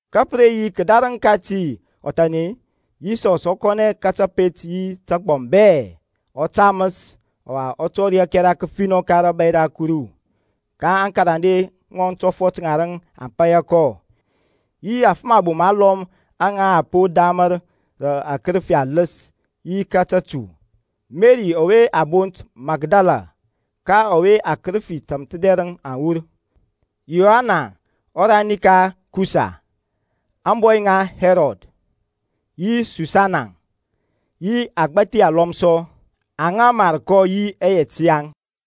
Ka pə re yi kədarəŋ kati ɔthan-e, Yisɔs ɔ kɔnɛ ka tapet yi tagbɔm bɛ, ɔ taməs, ɔwa ɔ tɔri ȧkɛra kəfinɔ ka rȧbȧy ra Kuru, ka aŋkarande ŋɔŋ tɔfɔt ŋarəŋ aŋ paya kɔ, yi afəm abom alɔm aŋa a po ramər rə akərəfi aləs yi ka tətu; Meri ɔwe a bont Makdala, ka ɔwe akərəfi tȧmthədɛrəŋ aŋ wur, Yoana ɔrani ka Kusa, ȧŋbɔy ŋa Hɛrɔd, yi Susana, yi agbȧthi alɔm sɔ, aŋa mar kɔ yi ɛyɛt yaŋ.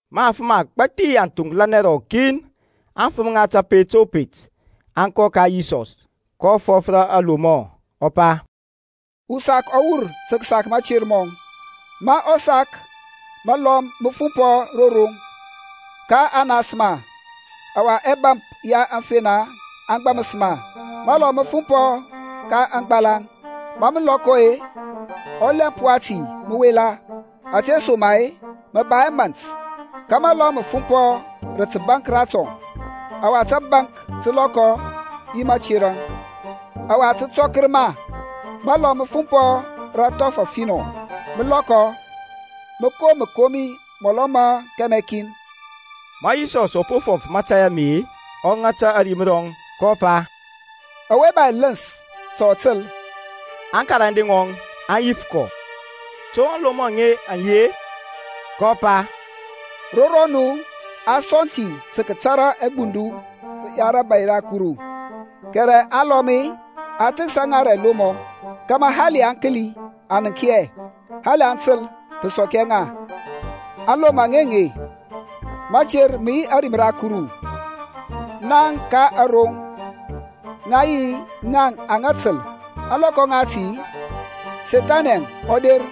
Ma afəm agbȧthi aŋ thoŋklanɛ rɔkin, aŋfəm ŋa kəpet o pet aŋ kɔ ka Yisɔsȧŋ, kɔ fɔf rə alomɔ, ɔ pa, Usak ɔ wur tə kəsak mater mɔŋ; ma ɔ sak məlɔm mə fumpɔ ro roŋ, ka a nas ma, ɔwa ɛbȧmp ya aŋfena aŋ gbaməs ma. Məlɔm mə fumpɔ rə agbalaŋ; ma mə lɔkɔ-e, ɔlɛmp wati mə wela, ȧtesoma-e mə ba hɛ mȧnt. Ka məlɔm mə fumpɔ rə təbaŋk ratɔŋ; ɔwa tabaŋk tə lɔkɔ yi mȧterȧŋ, ɔwa tə tɔkər ma. Məlɔm mə fumpɔ rə athɔf afinɔ, mə lɔkɔ, mə kom məkomi mɔlɔ ma kɛmɛ kin. Ma Yisɔs ɔ po fɔf mȧtȧy ame-e, ɔ ŋata ȧrim rɔŋ, kɔ pa, Ɔwe ba ɛləns ta ɔ təl. Aŋkarande ŋɔŋ aŋ yif kɔ, To aŋlomɔ aŋe an yi-e? kɔ pa, Ro rɔnu a sɔŋ ti tə kətara aŋgbundu ŋa rȧbȧy ra Kuru, kɛrɛ alɔm-e, a thəksa ŋa rə ɛlomɔ, kȧmȧ hali aŋ kəli aŋ nənk hɛ; hali aŋ təl-e, pə sɔk hɛ ŋa. Aŋlomɔ ŋi aŋe. Mater mə yi ȧrim ra Kuru. Ŋaŋ ka aroŋ ŋa yi ŋaŋ aŋa təl. Ȧŋlɔkɔ ŋati Sethani ɔ der,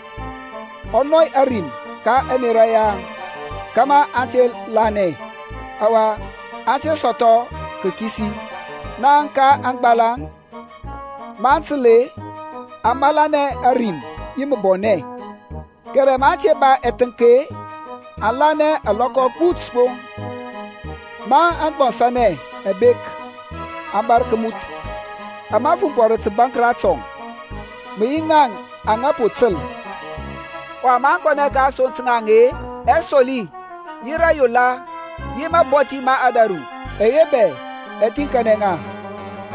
ɔ nɔy ȧrim ka ɛmerȧ yaŋ kȧmȧ aŋ te lanɛ, ɔwa aŋ te sɔthɔ kakisi. Ŋaŋ ka aŋgbalaŋ, maŋ təl-e, aŋ malanɛ ȧrim yi məbɔnɛ, kɛrɛ maŋ te ba ɛthənk-e, aŋ lanɛ alɔkɔ agbut gbo; ma aŋgbɔnsanɛ aŋ bek-e, aŋ bȧrȧ kəmuth. Ama fumpɔ rə tabaŋk ratɔŋ, mə yi ŋaŋ aŋa po təl. Ɔwa maŋ kɔnɛ ka asoŋ ta ŋaŋ-e, ɛsoli, yi rayola, yi mabɔthi ma ȧdȧru, ɛye bɛ ɛ thiŋkanɛ ŋa,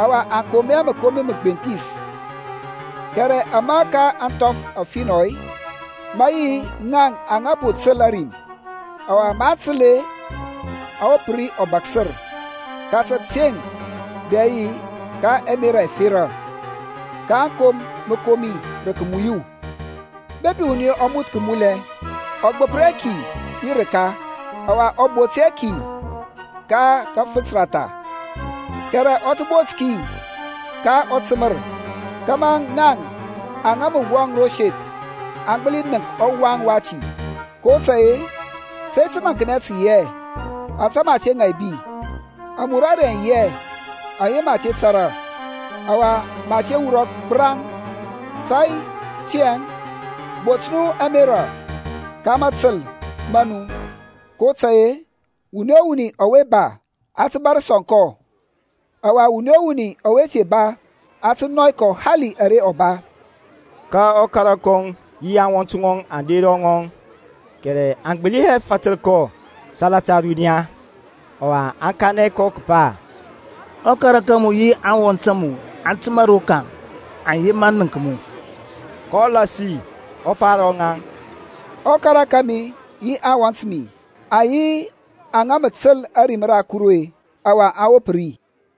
ɔwa aŋ kom hɛ məkomi məgbenthis. Kɛrɛ ama ka ȧŋthɔf afinɔ-e, mə yi ŋaŋ aŋa po təl ȧrim, ɔwa maŋ təl-e, aŋ wop ri ɔbaksər ka tȧteŋ dɛ yi ka ȧmerȧ ȧferȧ, kaŋ kom məkomi rə kəmuyu. Bepi wuni ɔ moth kəmulɛ, ɔ gbəpər hɛ ki yi rəka, ɔwa ɔ bot hɛ ki ka kəfənt ratha, kɛrɛ ɔ tə bot ki ka ɔtəmər kȧmȧ ŋaŋ aŋa mə wɔŋ ro seth aŋ gbəli nənk ɔwaŋ wati. kotȧy-e, tȧy təmaŋknɛ tə yi hɛ, ȧte mə a te ŋaibi; amurare aŋ yi hɛ aŋa mə a te tȧrȧ, ɔwa mə a te wurɔ gbəraŋ. Tiyȧŋ bot nu ȧmerȧ ka mȧtəl ma nu, kotȧy-e wuni o wuni ɔwe ba, a tə bȧr sɔŋ kɔ; ɔwa wuni o wuni ɔwe te ba, a tə nɔy kɔ hali ara ɔ ba. Ka ɔkara kɔŋ yi aŋwɔnt ŋɔŋ aŋ der ro ŋɔŋ, kɛrɛ aŋ gbəli hɛ fatər kɔ salata ȧruniya. Ɔwa a kanɛ kɔ kəpa, Ɔkara ka mu yi aŋwɔnt a mu aŋ təmȧ rokaŋ, aŋ yema nənk mu. kɔ lasi ɔ pa ro ŋaŋ, Ɔkara kȧmi yi aŋwɔnt mi aŋ yi aŋa mə təl ȧrim ra Kuru-e, ɔwa aŋ wop ri.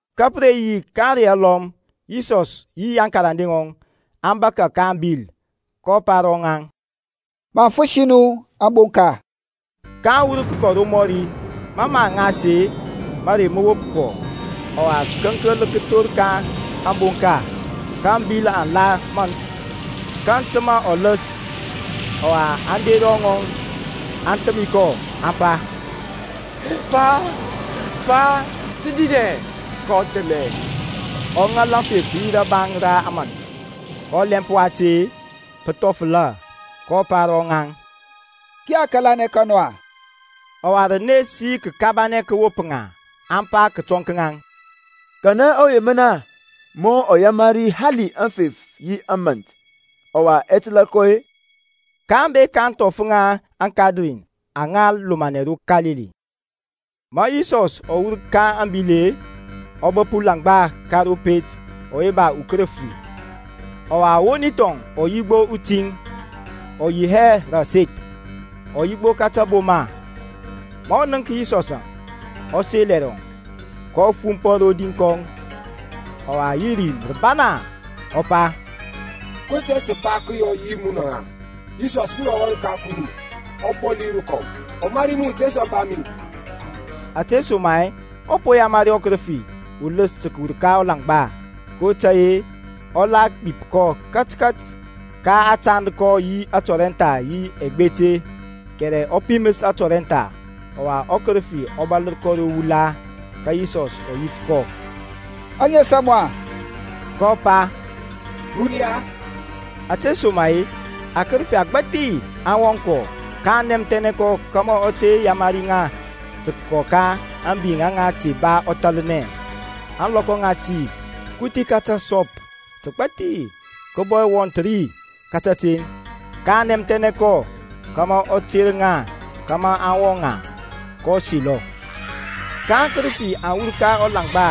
Ka pə re yi ka ȧŋrey alɔm, Yisɔs yi aŋkarande ŋɔŋ aŋ bȧkȧ ka ȧŋbil, kɔ pa ro ŋaŋ, Maŋ fəsi nu ȧŋbonka. Kaŋ wur kəkɔ romɔri. Mɔ mə aŋ ŋas-e, mərey mə wop kɔ, ɔwa kəŋkəl kə thor ka ȧŋbonka. Ka ȧŋbil aŋ la mȧnt, kaŋ təmȧ ɔləs. Ɔwa aŋ der ro ŋɔŋ, aŋ thəmi kɔ, aŋ pa, Pa, Pa, sə dinɛ. Kɔ thəmɛ, ɔ ŋal aŋfef yi rabaŋ ra ȧmȧnt. Ka ɔlɛmp wati-e, pə thɔfəla. kɔ pa ro ŋaŋ, Kiya kȧlanɛ ka nu-a? Ɔwa rənes yi kəkabanɛ kə wop ŋa, aŋ pa kətɔŋ ka ŋaŋ, Kanɛ ɔwe mən, ma ɔ yamari hali aŋfef yi ȧmȧnt, ɔwa ɛ təlȧ kɔ-e? kaŋ bek ka ȧŋthɔf ŋa aŋKadarin aŋa lomanɛ ro Kalili. Ma Yisɔs ɔ wur ka ȧŋbil-e, ɔ bəp ulaŋgba ka ro pet ɔwe ba ukərəfi. Ɔwa ɔwoni thɔŋ ɔ yi gbo utiŋ, ɔ yi hɛ rə aseth, ɔ yi gbo ka taboma. Ma ɔ nənk Yisɔsȧŋ, ɔ sel ɛrɔŋ, kɔ fumpɔ rodi kɔŋ, ɔwa yi rim rəbana ɔ pa, Ko tȧy tȧŋ i ba tə kəyɔ yi munɔ-ə Yisɔs, munɔ ɔWan ka Kuru ɔBɔli rəkɔm-e? Ɔmari mu, te sɔmpa mi. Ȧtesoma-e ɔ po yamari ɔkərəfi uləs tə kəwur ka ɔlaŋgba. Kotȧy-e ɔ la gbip kɔ katkat; ka a tand kɔ yi tɔrɛntha yi ɛgbete, kɛrɛ ɔ piməs atɔrɛntha, ɔwa ɔkərəfi ɔ bȧlər kɔ ro wula. Ka Yisɔs ɔ yif kɔ, Aŋes a mu-a? kɔ pa, Runia, ȧtesoma-e akərəfi agbȧthi aŋ wɔŋ kɔ. kaŋ nɛmthɛnɛ kɔ kȧmȧ ɔ te yamari ŋa tə kəkɔ ka ȧŋbi aŋa te ba ɔthȧlnɛ. Ȧŋlɔkɔ ŋati kuthi ka təsɔp təgbȧthi kə bɔ wɔnth ri ka kateŋ, kaŋ nɛmthɛnɛ kɔ kȧmȧ ɔ ter ŋa kȧmȧ aŋ wɔŋ ŋa. Kɔ selɔ. Ka aŋkərəfi aŋ wur ka ɔlaŋgba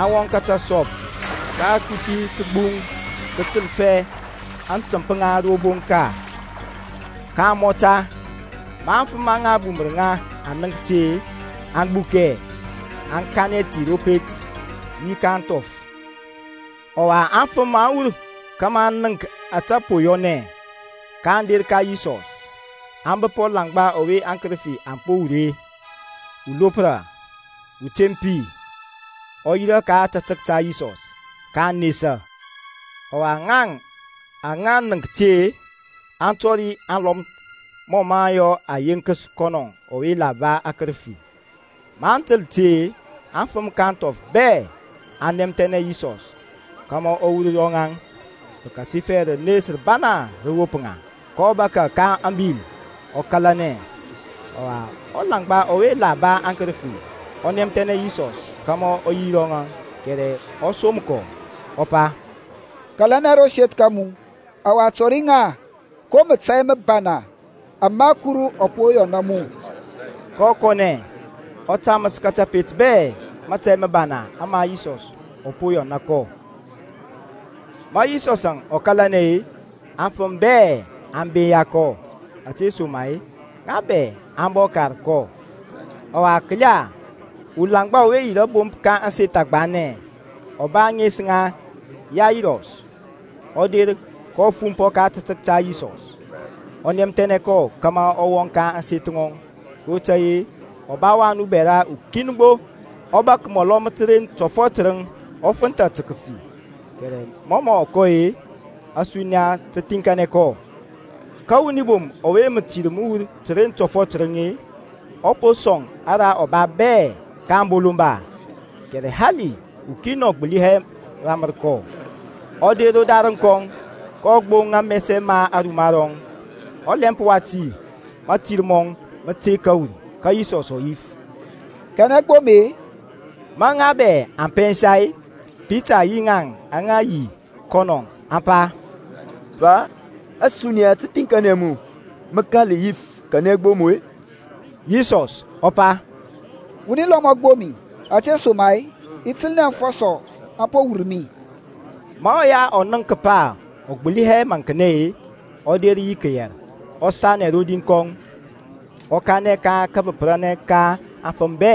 aŋ wɔŋ ka tasɔp; ka akuthi kə gbuŋ kətəlpɛ aŋtəmp ŋa ro bonka, kaŋ mɔta. Ma aŋfəm aŋa bumər ŋa aŋ ŋəŋk ti-e, aŋ gbukɛ, aŋ kanɛ ti ro pet, yi ka ȧŋthɔf. Ɔwa aŋfəm aŋ wur kȧmȧ aŋ nənk ȧtȧ po yɔnɛ, ka aŋ der ka Yisɔsȧŋ, aŋ bəp ɔlaŋgba ɔwe aŋkərəfi aŋ po wur-e, ulopra, utempi, ɔ yirȧ ka ȧtȧtək ta Yisɔs. Kaŋ nesa. Ɔwa, ŋaŋ aŋa nənk ti-e, aŋ tɔri aŋlɔm mɔ ɔ yɔ ɔ yenkəs kɔnɔ ɔwe la ba akərəfi. Maŋ təl ti-e, aŋfəm ka ȧŋthɔf bɛ aŋ nɛmthɛnɛ Yisɔs kȧmȧ ɔ wur ro ŋaŋ, pəkasifɛ rənes rəbana rə wop ŋa; kɔ bȧkȧ ka ȧŋbil ɔ kȧlanɛ. Ɔwa, ɔlaŋgba ɔwe la ba aŋkərəfi ɔ nɛmthɛnɛ Yisɔs kȧmȧ ɔ yi ro ŋɔŋ, kɛrɛ ɔ som kɔ, ɔ pa, Kȧlanɛ ro seth ka mu, ɔwa tɔri ŋa ko mȧtȧy məbana ama Kuru ɔ po yɔna mu. Kɔ kɔnɛ, ɔ taməs ka kȧpet bɛ mȧtȧy məbana ama Yisɔs ɔ po yɔna kɔ. Ma Yisɔsȧŋ ɔ kalanɛ-e, aŋfəm bɛ aŋ binya kɔ; ȧtesoma-e ŋa bɛ aŋ bɔ kar kɔ. Ɔwa kəla, ulaŋgba ɔwe yi rȧbomp ka ȧŋseth agbanɛ, ɔ ba ȧŋes ŋa Yairɔs, ɔ der, kɔ fumpɔ ka ȧtȧtək ta Yisɔs, ɔ nɛmthɛnɛ kɔ kȧmȧ ɔ wɔŋ ka ȧŋseth ŋɔŋ, kotȧy-e ɔ ba wan ubɛra ukin gbo, ɔ bȧk mɔlɔ ma təren tɔfɔt tərəŋ, ɔ fənthȧ tə kəfi. Kɛrɛ mɔ mɔ kɔ-e, ȧsuniya tə thiŋkanɛ kɔ. Ka wuni bom ɔwe mətir mə wur təren tɔfɔt tərəŋ-e, ɔ po sɔŋ ara ɔ ba bɛ ka aŋbolomba, kɛrɛ hali ukin ɔ gbəli hɛ ramər kɔ, ɔ der rodarəŋ kɔŋ, kɔ gboŋ amɛsɛ ma aruma rɔŋ. Ɔlɛmp wati mȧtir mɔŋ mə tey kəwur. Ka Yisɔs ɔ yif, Kanɛ gboŋ mi-e? Ma ŋaŋ bɛ aŋ pɛnsa-e, Pita yi ŋaŋ aŋa yi yi kɔnɔ aŋ pa, Pa, ȧsuniya tə thiŋkanɛ mu, mə kȧl yif kanɛ gboŋ mu-e? Yisɔs ɔ pa, Wuni lɔm ɔ gboŋ mi, ȧtesoma-e i təlnɛ afɔsɔ aŋ po wur mi. Ma ɔya ɔ nənk kəpa ɔ gbəli hɛ maŋknɛ-e, ɔ der yi kəyɛr, ɔ sanɛ rodi kɔŋ, ɔ kanɛ ka kabəpər ka aŋfəm bɛ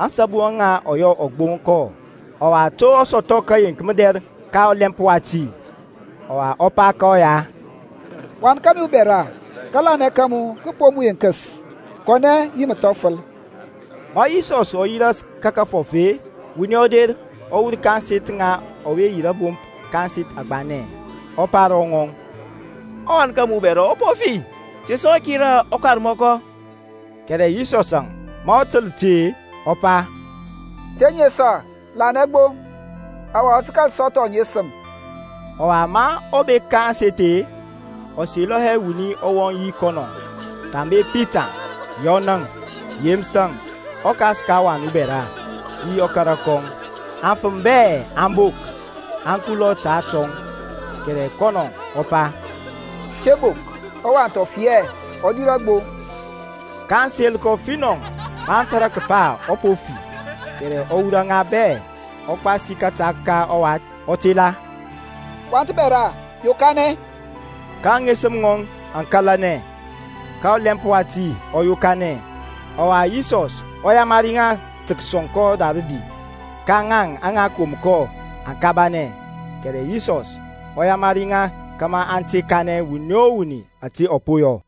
ȧŋsabu aŋa yɔ ɔ gboŋ kɔ, ɔwa to ɔ sɔthɔ kəyeŋk mədɛr ka ɔlɛmp wati. Ɔwa ɔ pa ka ɔya, Wan kȧmi ubɛra, kȧlanɛ ka mu kə po mu yenkəs. Kɔ yi məthɔfəl. Ma Yisɔs ɔ yi ras ka kəfɔf-e, wuni ɔ der, ɔ wur ka ȧŋseth ŋa ɔwe yi rȧbomp ka ȧŋseth agbanɛ, ɔ pa ro ŋɔŋ, Ɔwan ka mu bɛra ɔ po fi. Te sɔ kira ɔkarmɔkɔ. Kɛrɛ Yisɔsȧŋ ma ɔ təl ti-e, ɔ pa, Te nesa, lanɛ gbo. Ɔwa ɔ tə kȧl sɔthɔ ŋesəm. Ɔwa ma ɔ bek ka ȧŋseth-e, ɔ selɔ hɛ wuni ɔ wɔŋ yi kɔnɔ thambe Pitaŋ, Yɔnȧŋ, Yeməsȧŋ, ɔkas ka ɔwath ubɛra yi ɔkara kɔŋ. Aŋfəm bɛ aŋ bok, aŋ kulɔ ta atɔŋ, kɛrɛ kɔnɔ ɔ pa, Te bok, ɔwath ɔ fi hɛ, ɔ dirȧ gbo. kaŋ sel kɔ finɔ maŋ tȧrȧ kəpa ɔ po fi. Kɛrɛ ɔ wurɔ ŋa bɛ, ɔ gbasi kȧta ka ɔwath, ɔ tela, Wath bɛra, yokanɛ. Ka aŋesəm ŋɔŋ aŋ kȧlanɛ, ka ɔlɛmp wati ɔ yokanɛ; ɔwa Yisɔs ɔ yamari ŋa tə kəsɔŋ kɔ ra rədi. Ka ŋaŋ aŋa kom kɔ aŋ kabanɛ, kɛrɛ Yisɔsȧŋ ɔ yamari ŋa kȧmȧ aŋ te kanɛ wuni o wuni ȧte ɔ po yɔ.